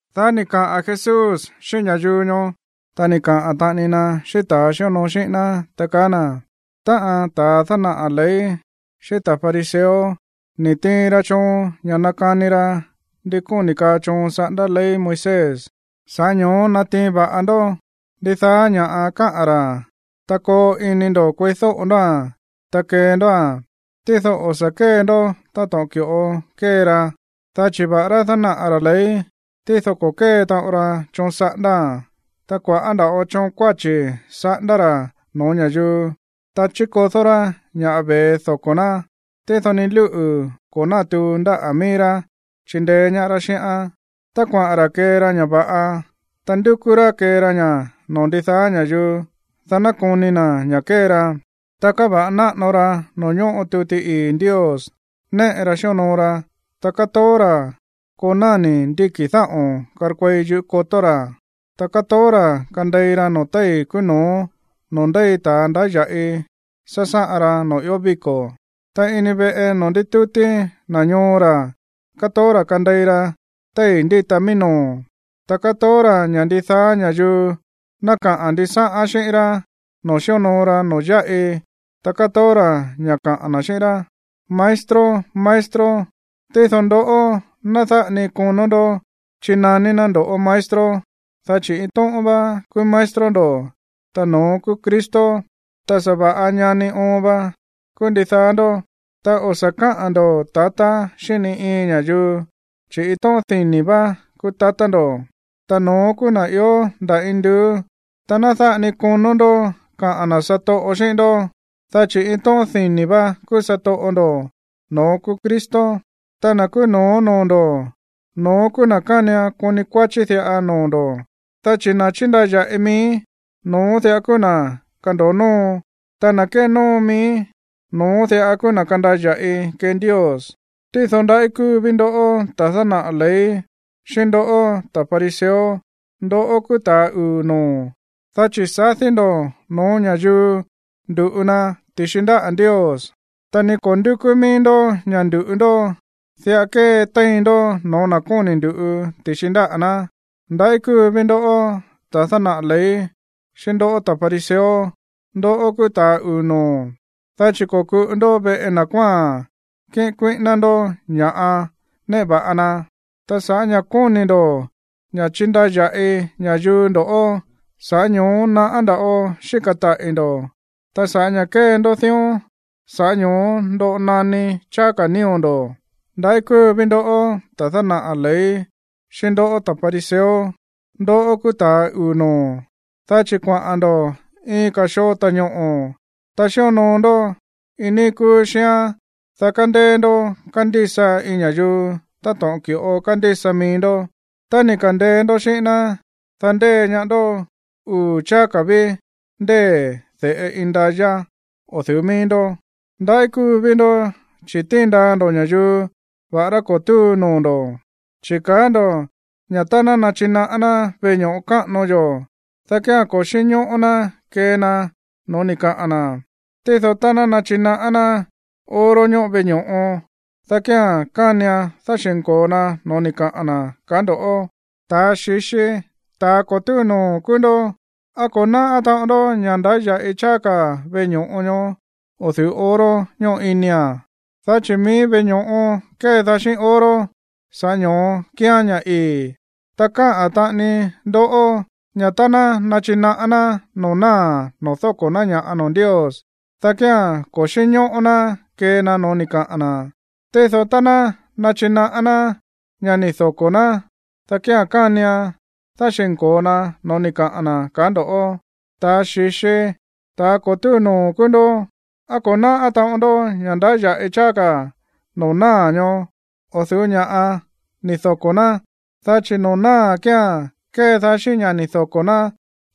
Dá ni̱ kaꞌa̱n Jesús xíꞌín ña̱yuu ñoó, ta ni̱ kaꞌa̱n taꞌani na xíꞌín ta̱ xíonoo xíꞌín ná, ta kaá na̱: ―Táꞌa̱n ta̱ dánaꞌa̱ ley xíꞌín ta̱ fariseo ni̱ tiin ra choon ña̱ nakani ra ndi kóni̱ kaa choon saꞌándá ley Moisés. Sa̱ꞌá ño̱ó natiin va̱ꞌa ndó ndidaá ña̱ꞌa káꞌa̱n ra̱, ta koo ini ndo̱ kueídóꞌo ndóa̱n, ta kee ndóa̱n. Tído o̱ sa̱ kée ndó táto̱ꞌon ki̱ꞌo kée ra, dá chi̱ va̱ꞌará dánaꞌa̱ ra̱ ley, tído ko̱ kée taꞌon ra choon saꞌándáa̱n. Ta kua̱ꞌá nda̱ꞌo choon kuáchi̱ saꞌándá ra̱ no̱ó ña̱yuu, ta chíkodó rá ña̱ ve̱e doko̱ ná, tído ni lúꞌu̱ ko̱ nátuu ndáꞌa̱ mií rá chíndeé ñaá rá xíꞌán. Tá kuaꞌa̱n ra̱ kée ra ña̱ va̱ꞌa, ta ndúkú rá kee ra ña̱ noo̱ ndidaá ña̱yuu, dá ná koni na̱ ña̱ kée ra. Ta káva̱ꞌa náꞌano ra noo̱ ñóꞌo tuti ii̱ Ndios néꞌe ra xíonoo ra, ta kátoó ra̱ koo náni̱ ndíki̱ dáꞌo̱n karkuei yúꞌu̱ kotó ra̱. Ta kátoó ra̱ kandei ra noo̱ téi̱ kúú no̱ó noo̱ ndéi ta̱ ndáya̱ꞌi sásáꞌan ra noo̱ ió víko̱. Ta ini veꞌe noo̱ ndítútí na̱ ñoo ra̱, kátoó ra̱ kandei ra téi̱ ndíta mií no̱ó. Ta kátoó ra̱ ña̱ ndidaá ña̱yuu ná kaꞌa̱n ndisáꞌán xíꞌín rá noo̱ xíonoo ra noo̱ yáꞌi, ta kátoó ra̱ ña̱ kaꞌa̱n na̱ xíꞌín rá, “Maestro, maestro.” ’Tído ndoꞌó, ná dáꞌa ni konó ndó chinaní ná ndo̱ꞌó maestro, dá chi̱ iin tóꞌón vá kúú maestro ndo̱, ta no̱ón kúú Cristo, ta sa̱va̱ꞌa ñani oon va kúú ndidaá ndó. Ta o̱ sa̱ káꞌa̱n ndo̱ tatá xíꞌín ni iin ña̱yuu, chi̱ iin tóꞌón dini̱ vá kúú tatá ndo̱, ta no̱ón kúú na̱ ió nda̱ induú. Ta ná dáꞌa ni konó ndó kaꞌa̱n na̱ satoꞌo xíꞌín ndó, dá chi̱ iin tóꞌón dini̱ vá kúú satoꞌo ndo̱, ta no̱ón kúú Cristo. Ta na̱ kúú no̱ó noo̱ ndo̱, no̱ón kúú na̱ kánian koni kuáchí diꞌa noo̱ ndo̱. Dá chi̱ na̱ chíndaya̱ꞌi mií, no̱ón diꞌa kúú na̱ kando̱o nóo. Ta na̱ kénóo mií, no̱ón diꞌa kúú na̱ kandaya̱ꞌi kee Ndios. ’Tído, ¡ndaꞌí kúu ví ndoꞌó, ta̱ dánaꞌa̱ ley, xíꞌín ndoꞌó, ta̱ fariseo! ¡Ndoꞌó kúú ta̱a uu̱ noo̱! Dá chi̱ sadí ndo̱ no̱ó ña̱yuu ndu̱ꞌu na ti̱xi ndáꞌa̱ Ndios, ta ni ko̱ ndúkú míí ndó ña̱ ndu̱ꞌu ndó, diꞌa kétéin ndó no̱ó na̱ kóni̱ ndu̱ꞌu ti̱xi ndáꞌa̱ ná. ¡Ndaꞌí kúu ví ndoꞌó, ta̱ dánaꞌa̱ ley, xíꞌín ndoꞌó, ta̱ fariseo! ¡Ndoꞌó kúú ta̱a uu̱ noo̱! Dá chi̱ ko̱kuꞌu ndó veꞌe na̱ kuáa̱n kíꞌin kuíꞌíná ndó ña̱ néꞌe va̱ꞌa na. Ta sa̱ꞌá ña̱ kóni̱ ndo̱ ña̱ chindaya̱ꞌi ña̱yuu ndo̱ꞌó, sa̱ꞌá ño̱ó naꞌá nda̱ꞌo xíka̱ taꞌi̱ ndo̱. Ta sa̱ꞌá ña̱ kée ndó dión, sa̱ꞌá ño̱ó ndoꞌo naní cháá ka̱ nío̱ ndo̱. ¡Ndaꞌí kúu ví ndoꞌó, ta̱ dánaꞌa̱ ley, xíꞌín ndoꞌó, ta̱ fariseo! ¡Ndoꞌó kúú ta̱a uu̱ noo̱! Dá chi̱ kuaꞌa̱n ndo̱ iin ka̱ xoo ta̱ñoꞌo̱, ta xíonoo ndó iin níí kúú xíán, dá kandeé ndó kandísa iin ña̱yuu to̱ꞌon ki̱ꞌo kándísa mií ndó. Tá ni̱ ka̱ndeé ndó xíꞌín ná, dá ndée ñaá ndó uu̱ cháá ka̱ ví ndée̱ de̱ꞌe indayá o̱ du̱ú mií ndó. ’¡Ndaꞌí kúú ví ndó, chi̱ tíin ndaa ndo̱ ña̱yuu va̱ꞌará ko̱ túu noo̱ ndo̱! Chi̱ kaá ndo̱ ña̱ tá ná nachinaꞌá ná veꞌe ño̱ꞌo káꞌano yó, dá kía̱n ko̱ xínñóꞌó ná kee na no̱ó ni̱ kaꞌa̱n na̱. Tído tá ná nachinaꞌá ná oro ñóꞌo veꞌe ño̱ꞌo, dá kía̱n kánian dáxi̱nko̱o na no̱ó ni̱ kaꞌa̱n na̱, kaá ndoꞌó. ¡Ta̱ xi̱xi, ta̱ ko̱ túu noo̱ kúú ndó! ¿Á ko̱ náꞌá taꞌon ndó ña̱ ndáya̱ꞌi cháá ka̱ veꞌe ño̱ꞌo ñoó o̱ du̱ú oro ñóꞌo inia̱n, dá chi̱ mií veꞌe ño̱ꞌo kédaá xíꞌín oro, sa̱ꞌá ño̱ó kíán ña̱ ii̱? Ta kaá taꞌani ndó ña̱ tá ná nachinaꞌá ná noo̱ náa̱ noo̱ dóko̱ ná ña̱ꞌa noo̱ Ndios, dá kía̱n ko̱ xínñóꞌó ná kee na no̱ó ni̱ kaꞌa̱n na̱. Tído tá ná nachinaꞌá ná ña̱ ni̱ doko̱ ná, dá kía̱n kánian dáxi̱nko̱o na no̱ó ni̱ kaꞌa̱n na̱, kaá ndo̱. ¡Ta̱ xi̱xi, ta̱ ko̱ túu noo̱ kúú ndó! ¿Á ko̱ náꞌá taꞌon ndó ña̱ ndáya̱ꞌi cháá ka̱ noo̱ náa̱ ñoó o̱ du̱ú ña̱ꞌa ni̱ doko̱ ná, dá chi̱ noo̱ náa̱ kía̱n kédaá xíꞌín ña̱ ni̱ doko̱ ná,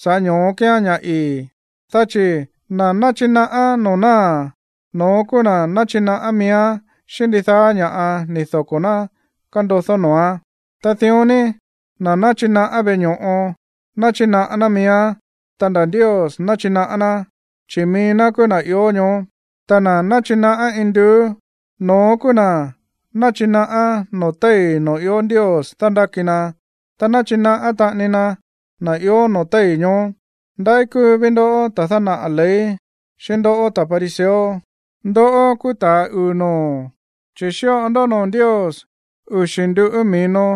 sa̱ꞌá ño̱ó kíán ña̱ ii̱? Dá chi̱ na̱ náchinaꞌá noo̱ náa̱, no̱ón kúú na̱ náchinaꞌá miíán xíꞌín ndidaá ña̱ꞌa ni̱ doko̱ ná kándodó noo̱án. Ta dión ní, na̱ náchinaꞌá veꞌe ño̱ꞌo, náchinaꞌá ná miíán, ta nda̱ Ndios náchinaꞌá ná, chi̱ mií ná kúú na̱ ió ñoó. Ta na̱ náchinaꞌá induú, no̱ón kúú na̱ náchinaꞌá noo̱ téi̱ noo̱ ió Ndios dándáki na, ta náchinaꞌá taꞌani na na̱ ió noo̱ téi̱ ñoó. ’¡Ndaꞌí kúu ví ndoꞌó, ta̱ dánaꞌa̱ ley, xíꞌín ndoꞌó, ta̱ fariseo! ¡Ndoꞌó kúú ta̱a uu̱ noo̱! Chi̱ xíꞌo ndó noo̱ Ndios uxi̱ nduꞌú mi̱no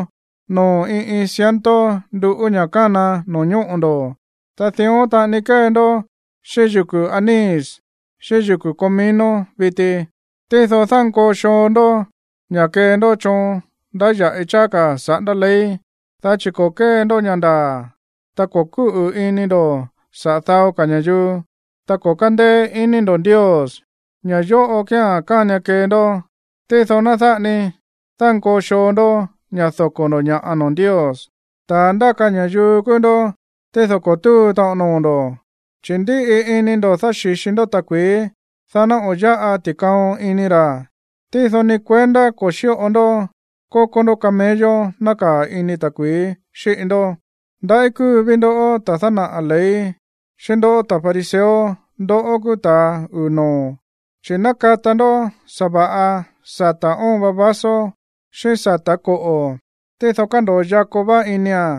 noo̱ iin iin ciento nduꞌú ña̱ kána no̱ñóꞌo̱ ndo̱, ta dión taꞌani kée ndó xíꞌín yuku̱ anís xíꞌín yuku̱ comino viti, tído dánkoo xoo ndó ña̱ kee ndó choon ndáya̱ꞌi cháá ka̱ saꞌándá ley, dá chi̱ ko̱ kée ndó ña̱ ndaa̱, ta ko̱ kúꞌu̱ ini ndo̱ saꞌa̱ dao ka̱ ña̱yuu, ta ko̱ kándéé iní ndo̱ Ndios. Ña̱ yóꞌo kía̱n kánian kee ndó, tído ná dáꞌa ni dánkoo xoo ndó ña̱ doko̱ ndo̱ ña̱ꞌa noo̱ Ndios. ¡Ta̱ ndáka ña̱yuu kúú ndó, tído ko̱ túu taꞌon noo̱ ndo̱! Chi̱ ndíꞌi ini ndo̱ dáxi̱xi ndó ta̱kui̱í, dá ná o̱ yáꞌa ti̱kaon ini ra̱, tído ni kuendá ko̱ xíꞌo ndó kokó ndó camello nákaa̱ ini ta̱kui̱í xíꞌi ndó. ’¡Ndaꞌí kúu ví ndoꞌó, ta̱ dánaꞌa̱ ley, xíꞌín ndoꞌó, ta̱ fariseo! ¡Ndoꞌó kúú ta̱a uu̱ noo̱! Chi̱ nákata ndó sa̱va̱ꞌa sata̱ óon va vaso, xíꞌín sata̱ koꞌo̱, tído kándo̱o yakó vá inia̱n.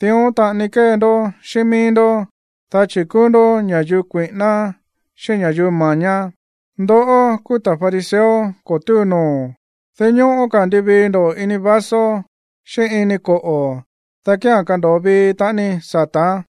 Dión taꞌani kée ndó xíꞌín mií ndó, dá chi̱ kúú ndó ña̱yuu kuíꞌíná, xíꞌín ña̱yuu mañá. ¡Ndoꞌó kúú ta̱ fariseo ko̱ túu noo̱! Dinñóꞌó ka̱ nduvii ndó ini vaso xíꞌín ini koꞌo̱, dá kía̱n kando̱o vii taꞌani sata̱án.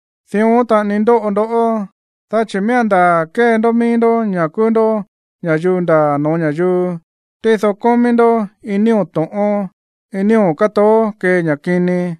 Dión taꞌani ndóꞌo ndoꞌó, dá chi̱ miía̱n ndaa̱ kée ndó mií ndó ña̱ kúú ndó ña̱yuu ndaa̱ no̱ó ña̱yuu, tído kómí ndó iin nío̱ to̱ꞌón, iin nío̱ kátoó kee ña̱ kini.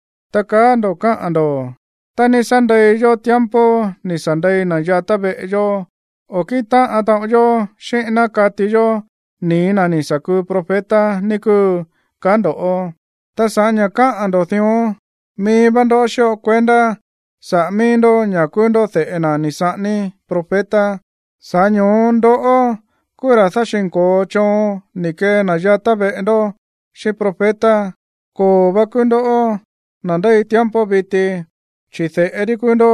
ta kaá ndo̱ káꞌa̱n ndo̱: “Tá ni̱ sa̱ ndei yó tiempo ni̱ sa̱ ndei na̱ yatá veꞌe yó, o̱ kíꞌin táꞌan taꞌon yó xíꞌín ná kati̱ yó nii̱ na̱ ni̱ sa̱ kuu profeta, ní kúu”, kaá ndo̱. Ta sa̱ꞌá ña̱ kaá ndo̱ dión, mií vá ndó xíꞌo kuendá saꞌa̱ mií ndó ña̱ kúú ndó de̱ꞌe na̱ ni̱ saꞌání profeta. Sa̱ꞌá ño̱ó ndoꞌó kúú ra̱ dáxi̱nko̱o choon ni̱ kee na̱ yatá veꞌe ndó xíꞌín profeta. ’¡Koo̱ vá kúú ndoꞌó, na̱ ndéi tiempo viti, chi̱ de̱ꞌe rí kúú ndó!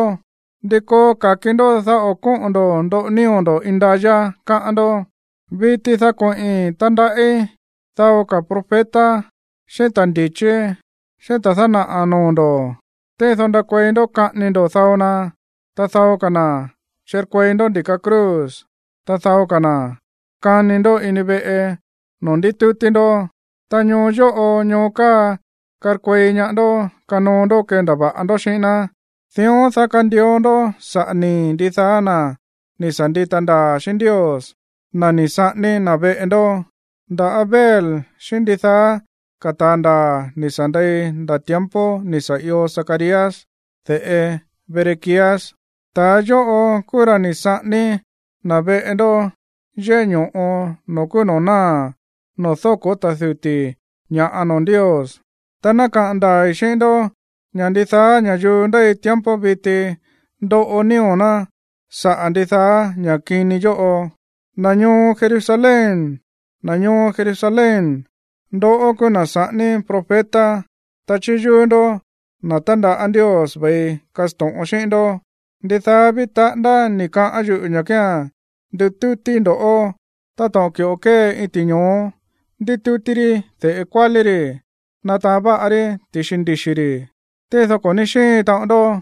¿Ndi koo ka̱ki ndó, dá o̱ kóꞌo̱n ndo̱ ndoꞌo nío̱ ndo̱ indayá, káꞌán ndó? ’Viti, dá koꞌi̱n tandaꞌí dao ka̱ profeta, xíꞌín ta̱ ndi̱chí, xíꞌín ta̱ dánaꞌa̱ noo̱ ndo̱. Tído ndakuei ndó kaꞌání ndó dao na, ta dao ka̱ na̱ chirkuei ndó ndi̱ka cruz, ta dao ka̱ na̱ kani ndó ini veꞌe noo̱ ndítútí ndó. Ta ñoo yóꞌo, ñoo káa karkuei ñaá ndó kanoo ndó kendava̱ꞌa ndó xíꞌín ná. Dión, dá kandio ndó sa̱ꞌá nii̱ ndidaá na̱ ni̱ sa̱ ndita ndaa̱ xíꞌín Ndios, na̱ ni̱ saꞌání na̱ veꞌe ndó, nda̱ Abel, xíꞌín ndidaá ka̱ ta̱a ndaa̱ ni̱ sa̱ ndei nda̱ tiempo ni̱ sa̱ io Zacarías, de̱ꞌe Berequías. Ta̱a yóꞌo kúú ra̱ ni̱ saꞌání na̱ veꞌe ndó yéꞌé ño̱ꞌo noo̱ kúú noo̱ náa̱ noo̱ dóko̱ ta̱ duti̱ ña̱ꞌa noo̱ Ndios. Ta ná kaꞌa̱n ndaa̱i̱ xíꞌín ndó ña̱ ndidaá ña̱yuu ndéi tiempo viti ndoꞌo nío̱ ná saꞌa̱ ndidaá ña̱ kini yóꞌo. ’¡Na̱ ñoo Jerusalén, na̱ ñoo Jerusalén, ndoꞌó kúú na̱ saꞌání profeta, ta chíyúú ndó na̱ tándaꞌá Ndios ve̱i kasto̱ꞌon xíꞌín ndó! ¡Ndidaá ví taꞌándá ni̱ kaꞌán yuꞌu̱ ña̱ kía̱n nditútíí ndo̱ꞌó táto̱ꞌon ki̱ꞌo kée iin ti̱ño̱ó ndítútí rí de̱ꞌe kuálí ri̱ nátaán va̱ꞌa rí ti̱i ndixi̱ ri̱! Tído ko̱ ní xíin taꞌon ndoꞌó.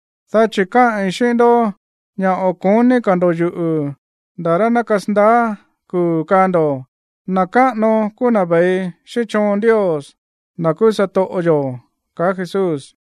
dá chi̱ káꞌi̱n xíꞌín ndó ña̱ o̱ ko̱ní ka̱ ndo̱ꞌó yuꞌu̱ nda̱ rá ná kasandaá kuu̱ kaa ndo̱, “Na̱ káꞌano kúú na̱ ve̱i xíꞌín choon Ndios, na̱ kúú satoꞌo yo̱” ―kaá Jesús.